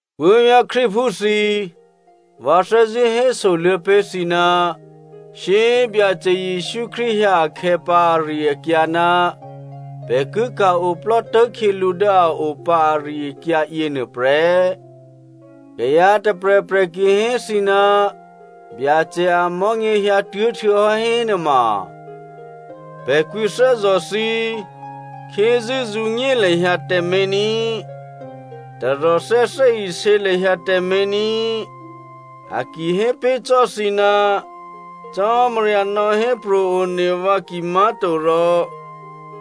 Puố̤vyá̤ Krístuphú thǐ꤮, vǎ thè́zṳ̂́ hésoluô̌ pé̤ thǐ ná shyé꤮ Byacè Jesǔ Krístu hyǎ akhè̌ pǎ ari-akyǎ ná pè̤ ki ka̤-oplò́ tố̤khyělǔ dố a o pǎ ari-akyǎ yěnuô prè́. Kayǎ tôprè̤prè̤ ki hé thǐ ná Byacè amò̤́nyě hyǎtuố̤ htuô̌hò́ hénuôma pè̤ kwǐthè́zò̤ thǐ꤮, khyézû́ zǔnyé lahyǎ tǎmé̤ ní꤮, taròthè́ thè́isě lahyǎ tǎmé̤ ní꤮. A ki hé pé̤ cò́ thǐ, Cò́marya nò̌hépro̤ one vǎ kimá̤torò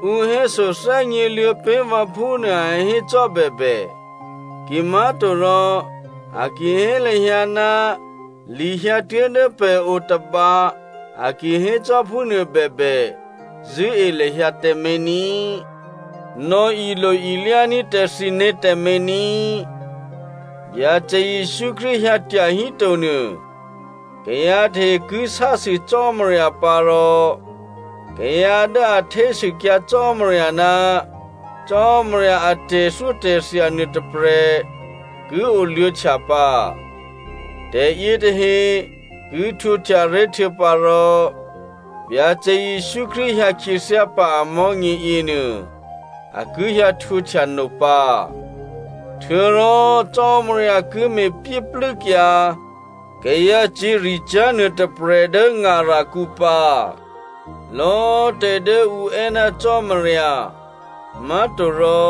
ǔ héso thè́gněluô̌ pé̤ vǎ phúnuô a hécò́ bèbè, kimá̤torò a ki hé lahyǎ ná li hyǎtuố̤ dố pè̤ o tôba, a ki hécò́ phúnuô bèbè zṳ̂́e lahyǎ tǎmé̤ ní꤮. Nò̌ilo-ilyání̤ tǎ thǐné̤ tǎmé̤ ní꤮. Byacè Jesǔ Krístu hyǎ tyahíto nuô, kayǎ tahe ki sásû Cò́marya pǎ rò kayǎ dố a htésûkyǎ Cò́marya ná Cò́marya a tè̤thyótè̤thya nuôtôprè̤ ki oluô̌htya pǎ. Tè̤yětahe ki htwǒhtyaré̤ htuô̌pǎrò Byacè Jesǔ Krístu hyǎ khyěthyá pǎ amò̤́nyě yěnuô a ki hyǎ htwǒhtya no pǎ. Htuô̌rò Cò́marya ki me̤pyéplû́kyǎ kayǎcyě̤ricyá̤ nuôtôprè̤ dố ngarakǔ pǎ. Lò̌꤮ tè̤dố ǔ è́ ná Cò́marya, má̤torò,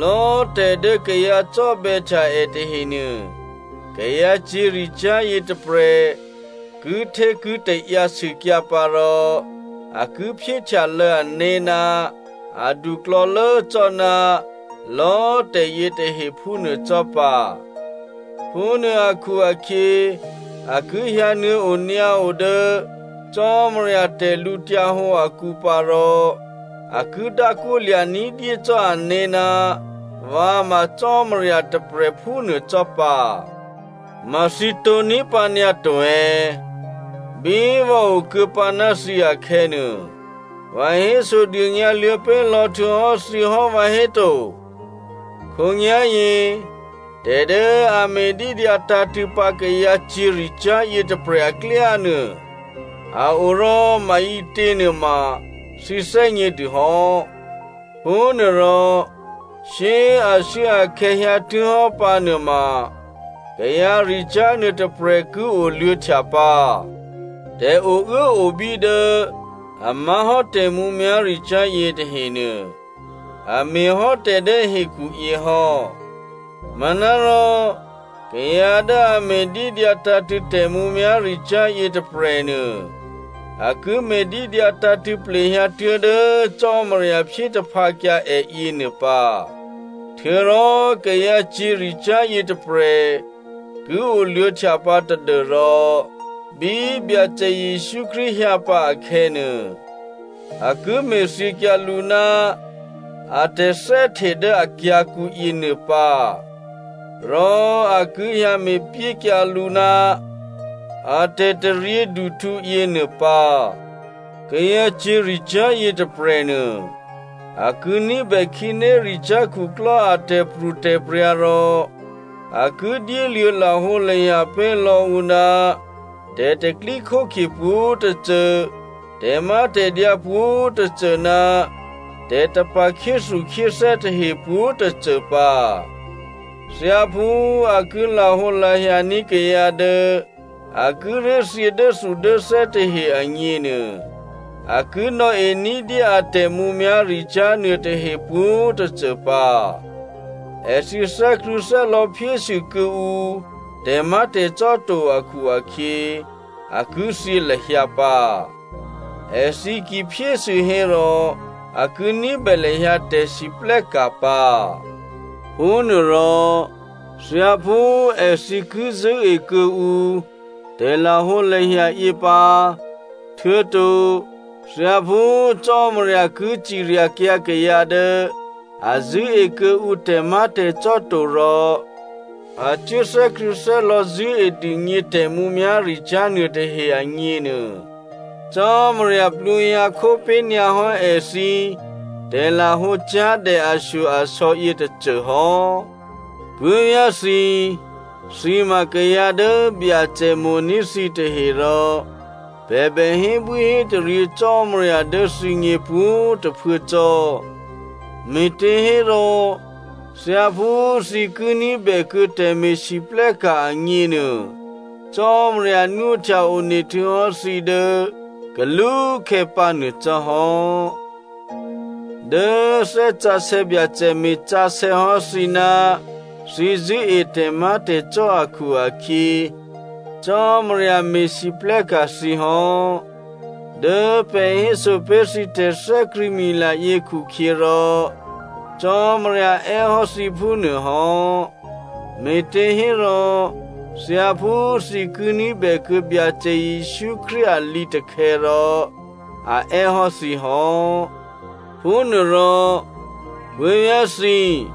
lò̌꤮ tè̤dố kayǎ cò́bè̌htya è tahenuô, kayǎ cyě̤ricyá̤ yětôprè̤ kihtékitaǎyǎ sûkyǎ pǎ rò a ki phyéhtyalô̌ ané̤ ná aduklò̌lố cò́ ná lò̌꤮ tè̤yětahe phúnuô cò́ pǎ. Phúnuô akhu-akhyě, a ki hyǎnuô̌ o nyǎo dố Cò́marya tè̤lǔhǒdu akǔ pǎ rò a ki dákwólya̤ ní̤dyé cò́ ané̤ ná vǎ ma Cò́marya tôprè̤ phúnuô cò́ pǎ. Ma thǐ tǒ̤ní̤ pǎnyǎ to è̌? Bí vǎ o kuô̌pǎ ná thǐ akhè̌nuô, vǎ hésodônyǎ luô̌ pé̤lò̌ htuô̌hò́ thǐ hò́, vǎhéto? Khǒnyá̤yě tè̤dố a me̤dídyǎ tǎ̤tṳ̂̌ pǎ kayǎ cyě̤ricyá̤ yětôprè̤ aklyánuô a o rò maǐtě nuôma thǐ thè́gnědûhò́. Phúnuôrò shyé꤮ ashuốakhè̌ hyǎtuố̤hò́ pǎnuô ma kayǎricyá̤ nuôtôprè̤ ki oluô̌htya pǎ. Tè̤ouốobí dố a má̤hò́ tè̤mǔmyá̤ricyá̤ yětahenuô, a me̤hò́ tè̤dố hekhuyě hò́. Manárò kayǎ dố a me̤dídyǎ tǎ̤tṳ̂̌ tè̤mǔmyá̤ricyá̤ yětôprè̤nuô, a ki me̤dídyǎ tǎ̤tṳ̂̌ plehyǎ tuố̤dố Cò́marya phyétaphǎkyǎ è yěnuô pǎ. Htuô̌rò kayǎ cyě̤ricyá̤ yětôprè̤ ki oluô̌htya pǎ tadû́rò bí Byacè Jesǔ Krístu hyǎ pǎ akhè̌nuô, a ki me̤thyěkyǎ lǔ ná a tè̤thè́hte dố akyǎ̤kǔ yěnuô pǎ, rò a ki hyǎ me̤pyékyǎ lǔ ná a tè̤taryěduhtǔ yěnuô pǎ. Kayǎ cyě̤ricyá̤ yětôprè̤nuô a ki ní̤bè khǐnéricyá̤ khuklò́ a tè̤pro̤tè̤prya̤ rò a ki dyéluô̌ lahǒlahya pé̤ lò̌ ǔ ná tè̤pro̤tè̤prya̤ pwǒ̤tôcô, tè̤mátè̤dyǎ pwǒ̤꤮ tôcô ná tè̤tapa̤ khyéthukhyéthè́ tahe pwǒ̤꤮ tôcô pǎ. Thyáphú a ki lahǒlahyaní̤ kayǎ dố a kíré̤ thyě dốthudốthè́ tahe agněnuô, a ki nò̌e ní̤dyé a tè̤mǔmyá̤ricyá̤ nuôtahe pwǒ̤꤮ tôcô pǎ. Èthǐ thè́krṳ̂̌thè́lò̌ phyésû kuô̌ǔ tè̤má̤tè̤cò́ to akhu-akhyě, a ki thyě lahyǎ pǎ. Èthǐ ki phyésû hérò a ki ní̤bè lahyǎ tè̤siplè́ka̤ pǎ. Phúnuôrò thyáphú èthǐ ki zṳ̂́e kuô̌ǔ tè̤lahǒlahya yě pǎ, htuô̌to thyáphú Cò́marya ki ciryakyǎ kayǎ dố a zṳ̂́e kuô̌ǔ tè̤má̤tè̤cò́ to rò a cuố thè́krṳ̂̌thè́lò̌ zṳ̂́e dûgně tè̤mǔmyá̤ricyá̤ nuôtahe agněnuô, Cò́marya plwǒhyǎ khó pé̤nyǎ hò́ èthǐ tè̤lahǒcyá̤dè ashyo-asò̌ yětôcô hò́. Puố̤vyá̤thǐ꤮, thǐ ma kayǎ dố Byacè mo̤ní̤ thǐtahe rò pè̤ bè hébwíhétaryě Cò́marya dố thǐgně pwǒ̤꤮ tôphuố cò́, me̤těhérò thyáphú thǐ ki ní̤bè kuô̌ tè̤me̤lwóhteka̤ agněnuô, Cò́marya nwóhtya one htuô̌hò́ thǐ dố kalúkhè̌ pǎnuô cò́ hò́. Dố Thè́ Sǎsè̌ Byacè me̤sǎsè̌ hò́ thǐ ná thǐ zṳ̂́e tè̤má̤tè̤cò́ akhu-akhyě, Cò́marya me̤lwóhteka̤ thǐ hò́. Dố pè̤ héso pé̤ thǐ tè̤thè́krṳ̂̌mila yě khukhyěrò Cò́marya è́ hò́ thǐ phúnuô hò́. Me̤těhérò thyáphú thǐ ki ní̤bè kuô̌ Byacè Jesǔ Krístu a lǐtakhè̌ rò a è́ hò́ thǐ hò́. Phúnuôrò puố̤vyá̤ thǐ꤮,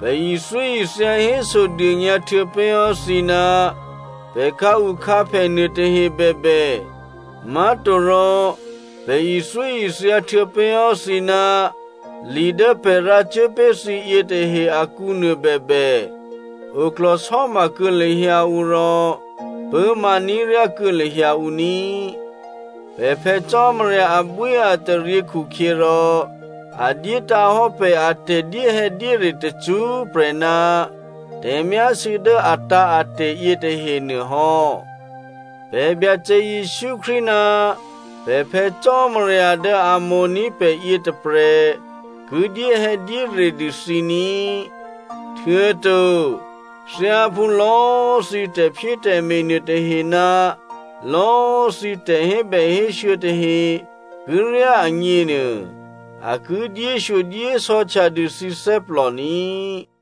pè̤ ithyóithya hésodônyǎ htuô̌pé̤hò́ thǐ ná pè̤ khǎukhǎphè nuôtahe bèbè, má̤torò pè̤ ithyóithya htuô̌pé̤hò́ thǐ ná li dố pè̤ rǎ cuố pé̤ thǐ yětahe akǔnuô bèbè, oklò̤sò́ma kuô̌ lahyǎ ǔ rò pṳ̂́ma ní̤ ryá kuô̌ lahyǎ ǔ ní꤮. Pè̤ Phè̌ Cò́marya abwíataryě khukhyěrò a dyétǎ̤ hò́ pè̤ a tè̤dyéhè̌dyére tacṳ́prè̤ ná tè̤myásû̌ dố atǎ̤ate̤ yětahenuô hò́. Pè̤ Byacè Jesǔ Krístu ná pè̤ Phè̌ Cò́marya dố a mo̤ní̤ pè̤ yětôprè̤ ki dyéhè̌dyére dû thǐ ní꤮. Htuô̌to thyáphú lò̌꤮ thǐ tè̤phyétè̤me̤ nuôtahe ná lò̌꤮ thǐ tè̤hébèhésû̌ tahe ki ryá agněnuô, a ki dyéshyodyésò̌htya dû thǐ thè́plò ní꤮.